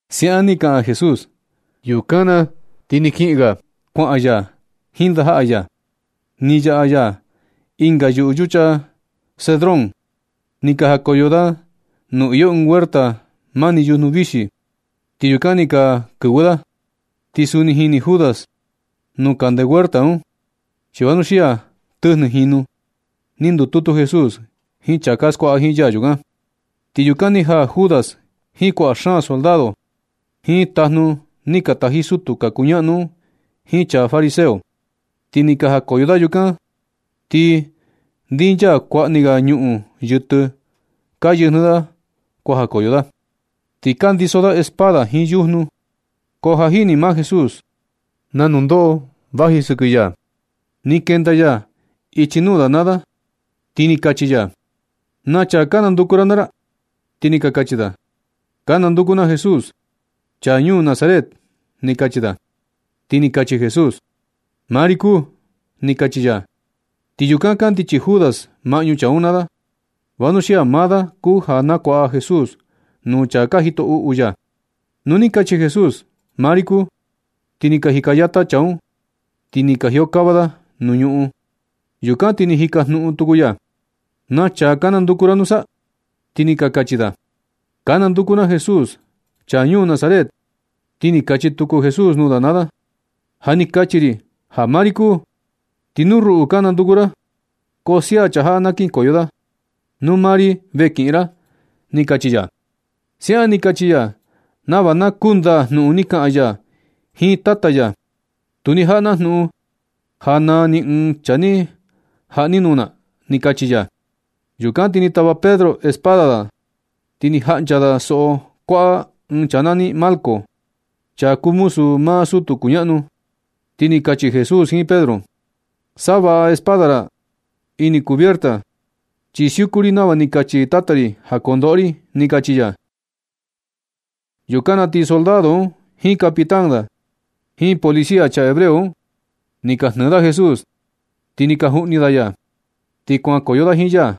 Siaꞌan ni kaꞌan Jesús, yukan na ti kiꞌin ga. Kuaꞌan ya jiin ndajaꞌa ya. Ni yaꞌa ya ɨnga yuꞌu yucha Cedrón. Ni ka jakoyo da nuu iyo ɨɨn huerta mani yujnu vixi, ti yukan ni ka kɨvɨ da. Ti suni jini Judas nuu kande huerta un, chi vanuxia tɨjnɨ jinu ni ndututu Jesús jiin chaa ka skuaꞌa jiin ya yukan. Ti yukan ni jaa Judas jiin kuaꞌa xaan soldado, jiin tajnu ni ka taji sutu ka kuñaꞌnu un jiin chaa fariseo, ti ni ka jakoyo da yukan. Ti ndinchaa kuaꞌa ni ga ñuꞌun yɨtɨ ka yɨjnɨ da kuajakoyo da. Ti ka ndiso da espada jiin yujnu. Ko ja jini maa Jesús na nundoꞌo vaji sɨkɨ ya. Ni kenda ya ichi nuu da naa da, ti ni kachi ya: ―¿Na chaa ka nanduku ra naa ra? Ti ni ka kachi da: ―Ka nanduku na Jesús, chaa ñuu Nazaret ―ni kachi da. Ti ni kachi Jesús: ―Maa ri kuu ―ni kachi ya. Ti yukan kandichi Judas maꞌñu chaa un naa da, vanuxia maa da kuu ja ni nakuaꞌa Jesús nuu chaa ka jito uꞌu ya. Nu ni kachi Jesús: “Maa ri kuu”, ti ni ka jika yata chaa un, ti ni ka jiokava da nuu ñuꞌun. Yukan ti ni jikajnuꞌun tuku ya: ―¿Na chaa ka nanduku ra nusa? Ti ni ka kachi da: ―Ka nanduku na Jesús, chaa ñuu Nazaret. Ti ni kachi tuku Jesús nuu da naa da: ―Ja ni kachi ri ja maa ri kuu, ti nu ruꞌu ka nanduku ra ko sia chaa jaꞌa na kinkoyo da, nuu maa ri ve kiꞌin ra ―ni kachi ya. Siaꞌan ni kachi ya nava na kundaa jnuꞌun ni kaꞌan ya jiin Tata ya: “Tu ni jaꞌa na jnuꞌun ja naa ni ɨɨn chaa ni jaꞌa ni nuu na”, ni kachi ya. Yukan ti ni tava Pedro espada da, ti ni jaꞌncha da soꞌo kuaꞌa ɨɨn chaa nani Malco, chaa kuu muzu maa sutu kuñaꞌnu. Ti ni kachi Jesús jiin Pedro: ―Nasavaꞌa espada ra ini cubierta. Chi siuku ri nava ni kachi Tata ri ja kondoꞌo ri ―ni kachi ya. Yukan na ti soldado un jiin capitán da, jiin policía chaa hebreo un, ni ka jnɨɨ da Jesús, ti ni ka juꞌni da ya. Ti kuankoyo da jiin ya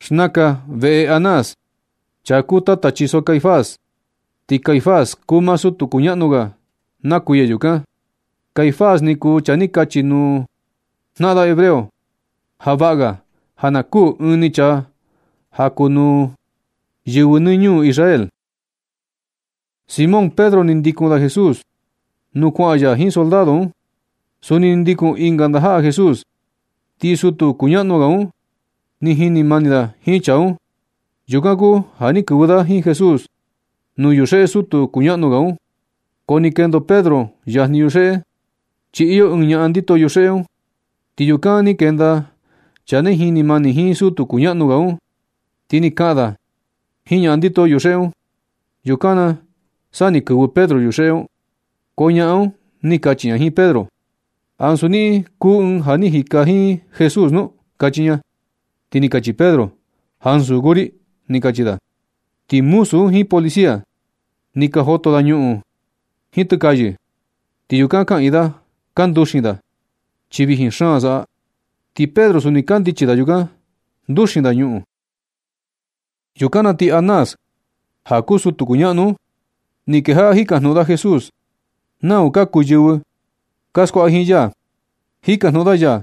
xnakan veꞌe Anás, chaa kuu tata chiso Caifás. Ti Caifás kuu maa sutu kuñaꞌnu ga na kuiya yukan. Caifás ni kuu chaa ni kachi nuu jnaꞌan da hebreo ja vaꞌga ja na kuū ɨɨn ni chaa ja kuu nuu yɨvɨ nɨ ñuu Israel. Simón Pedro ni ndikun da Jesús nuu kuaꞌan ya jiin soldado un. Suni ni ndikun ɨnga ndajaꞌa Jesús. Ti sutu kuñaꞌnu ga un ni jini mani da jiin chaa un. Yukan kuu ja ni kɨvɨ da jiin Jesús nuu yuxeꞌe sutu kuñaꞌnu ga un. Ko ni kendo Pedro yajni yuxeꞌe. Chi iyo ɨɨn ñaꞌan ndito yuxeꞌe un. Ti yukan ni kenda chaa ni jini mani jiin sutu kuñaꞌnu ga un, ti ni kaꞌan da jiin ñaꞌan ndito yuxeꞌe un. Yukan na sa ni kɨvɨ Pedro yuxeꞌe un. Ko ñaꞌan un ni kachi ña jiin Pedro: ―¿Ansu niꞌin kuu ɨɨn ja ni jika jiin Jesús nu? ―kachi ña. Ti ni kachi Pedro: ―Ansu kuu ri ―ni kachi da. Ti muzu un jiin policía, ni ka joto da ñuꞌun jiin tɨkayɨ, ti yukan kaꞌiin da ka nduxin da, chi vijin xaan saꞌa. Ti Pedro, suni kandichi da yukan, nduxin da ñuꞌun. Yukan na ti Anás, ja kuu sutu kuñaꞌnu un, ni kejaꞌa jikajnuꞌun da Jesús nau ka kuu yɨvɨ ka skuaꞌa jiin ya. Jikajnuꞌun da ya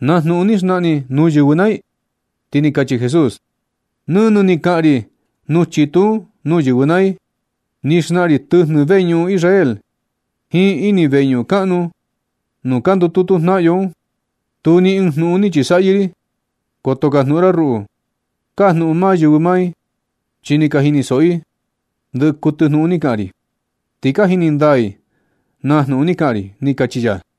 na jnuꞌun ni xnaꞌan ni nuu yɨvɨ naa i. Ti ni kachi Jesús: ―Nɨnɨ ni kaꞌan ri nuu chitu un nuu yɨvɨ naa i. Ni xnaꞌan ri tɨjnɨ veñuꞌun Israel jiin ini veñuꞌun kaꞌnu nuu ka ndututu jnaꞌan yo un. Tu ni ɨɨn jnuꞌun ni chi saꞌyɨ ri. Koto kajnuꞌun ra ruꞌu. Kajnuꞌun maa yɨvɨ naa i, chi ni ka jinisoꞌo i ndɨ kuɨtɨ jnuꞌun ni kaꞌan ri. Ti ka jini ndaa i na jnuꞌun ni kaꞌan ri ―ni kachi ya.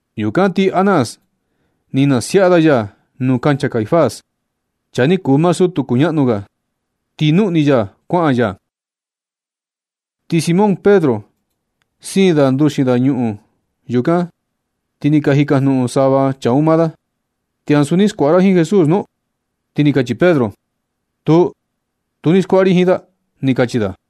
Yukan ti Anás, ni nasiaꞌa da ya nuu kancha Caifás, chaa ni kuu maa sutu kuñaꞌnu ga. Ti nuꞌni ya kuaꞌan ya. Ti Simón Pedro siin da nduxin da yuñuꞌun yukan, ti ni ka jikajnuꞌun sava chaa un maa da: ―¿Ti ansu ni skuaꞌa ra jiin Jesús nu? Ti ni kachi Pedro: ―Tuu, tu ni skuaꞌa ri jiin da ―ni kachi da.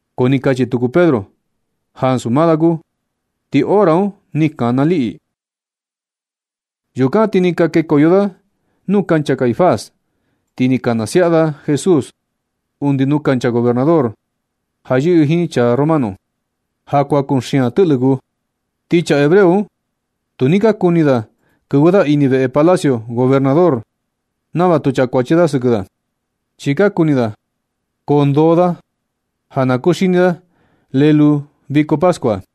Ko ni kachi tuku Pedro ja ansu maa da kuu. Ti hora un ni kana liꞌi. Yukan ti ni ka kekoyo da nuu kancha Caifás, ti ni ka nasiaꞌa da Jesús undi nuu kancha gobernador ja yɨꞌɨ jiin chaa romano. Ja kuan kuxian tɨꞌlɨ kuu. Ti chaa hebreo un tu ni ka kuni kɨvɨ da ini veꞌe palacio gobernador nava tu chakuachi da sɨkɨ da, chi ka kuni da koo ndoo da ja na kuxini da lelu viko pascua.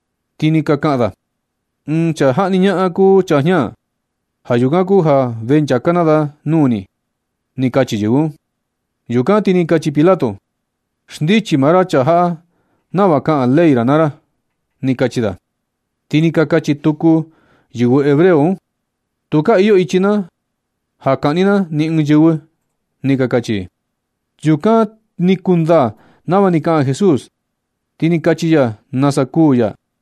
Ti ni ka kaꞌan da: ―Ɨɨn chaa jaꞌni ñaꞌan kuu chaa jña. Ja yukan kuu ja vee nchaka na da nuu ni ―ni kachi yɨvɨ un. Yukan ti ni kachi Pilato: ―Xndichi maa ra chaa jaꞌa nava kaꞌan ley ra naa ra ―ni kachi da. Ti ni ka kachi tuku yɨvɨ hebreo un: ―Tu ka iyo ichi na ja kaꞌni na ni ɨɨn yɨvɨ ―ni ka kachi i. Yukan ni kundaa nava ni kaꞌan Jesús, chi ni kachi ya nasa kuū ya.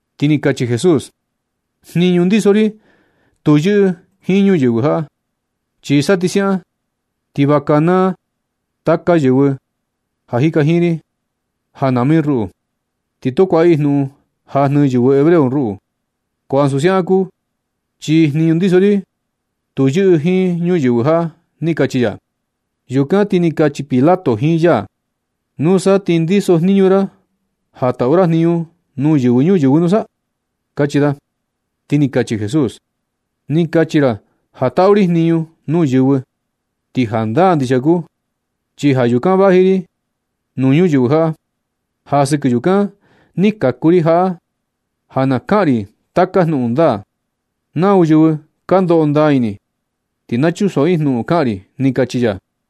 Ti ni kachi Jesús: ―Jniñu ndiso ri tu yɨꞌɨ jiin ñuyɨvɨ jaꞌa. Chi sa ti siaꞌan, ti va kanaa taka yɨvɨ ka jika jiin ri ja nama i ruꞌu, ti tu kuaꞌa i jnuꞌun ja jnɨɨ yɨvɨ hebreo ruꞌu. Ko ansu siaꞌan kuu, chi jniñu ndiso ri tu yɨꞌɨ jiin ñuyɨvɨ jaꞌa ―ni kachi ya. Yukan ti ni kachi Pilato jiin ya: ―¿Nusa ti ndiso jniñu ra ja taꞌu ra jniñu nuu yɨvɨ ñuyɨvɨ nusa? ―kachi da. Ti ni kachi Jesús: ―Ni kachi ra ja taꞌu ri jniñu nuu yɨvɨ. Ti jandaa ndixia kuu, chi ja yukan vaji ri nuu ñuyɨvɨ jaꞌa. Ja sɨkɨ yukan ni kaku ri jaꞌa ja na kaꞌan ri taka jnuꞌun ndaa. Nau yɨvɨ ka ndoꞌo ndaa ini, ti na chunsoꞌo i jnuꞌun kaꞌan ri ―ni kachi ya.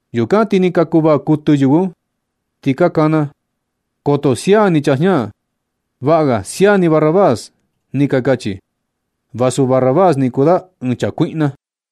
Yukan ti ni ka kuvaa kuɨtɨ yɨvɨ un, ti ka kana: ―¡Koto sia ni chaa jña! ¡Vaꞌa ga sia ni Barrabás! ―ni ka kachi. Vasu Barrabás ni kuu da ɨɨn chaa kuiꞌna.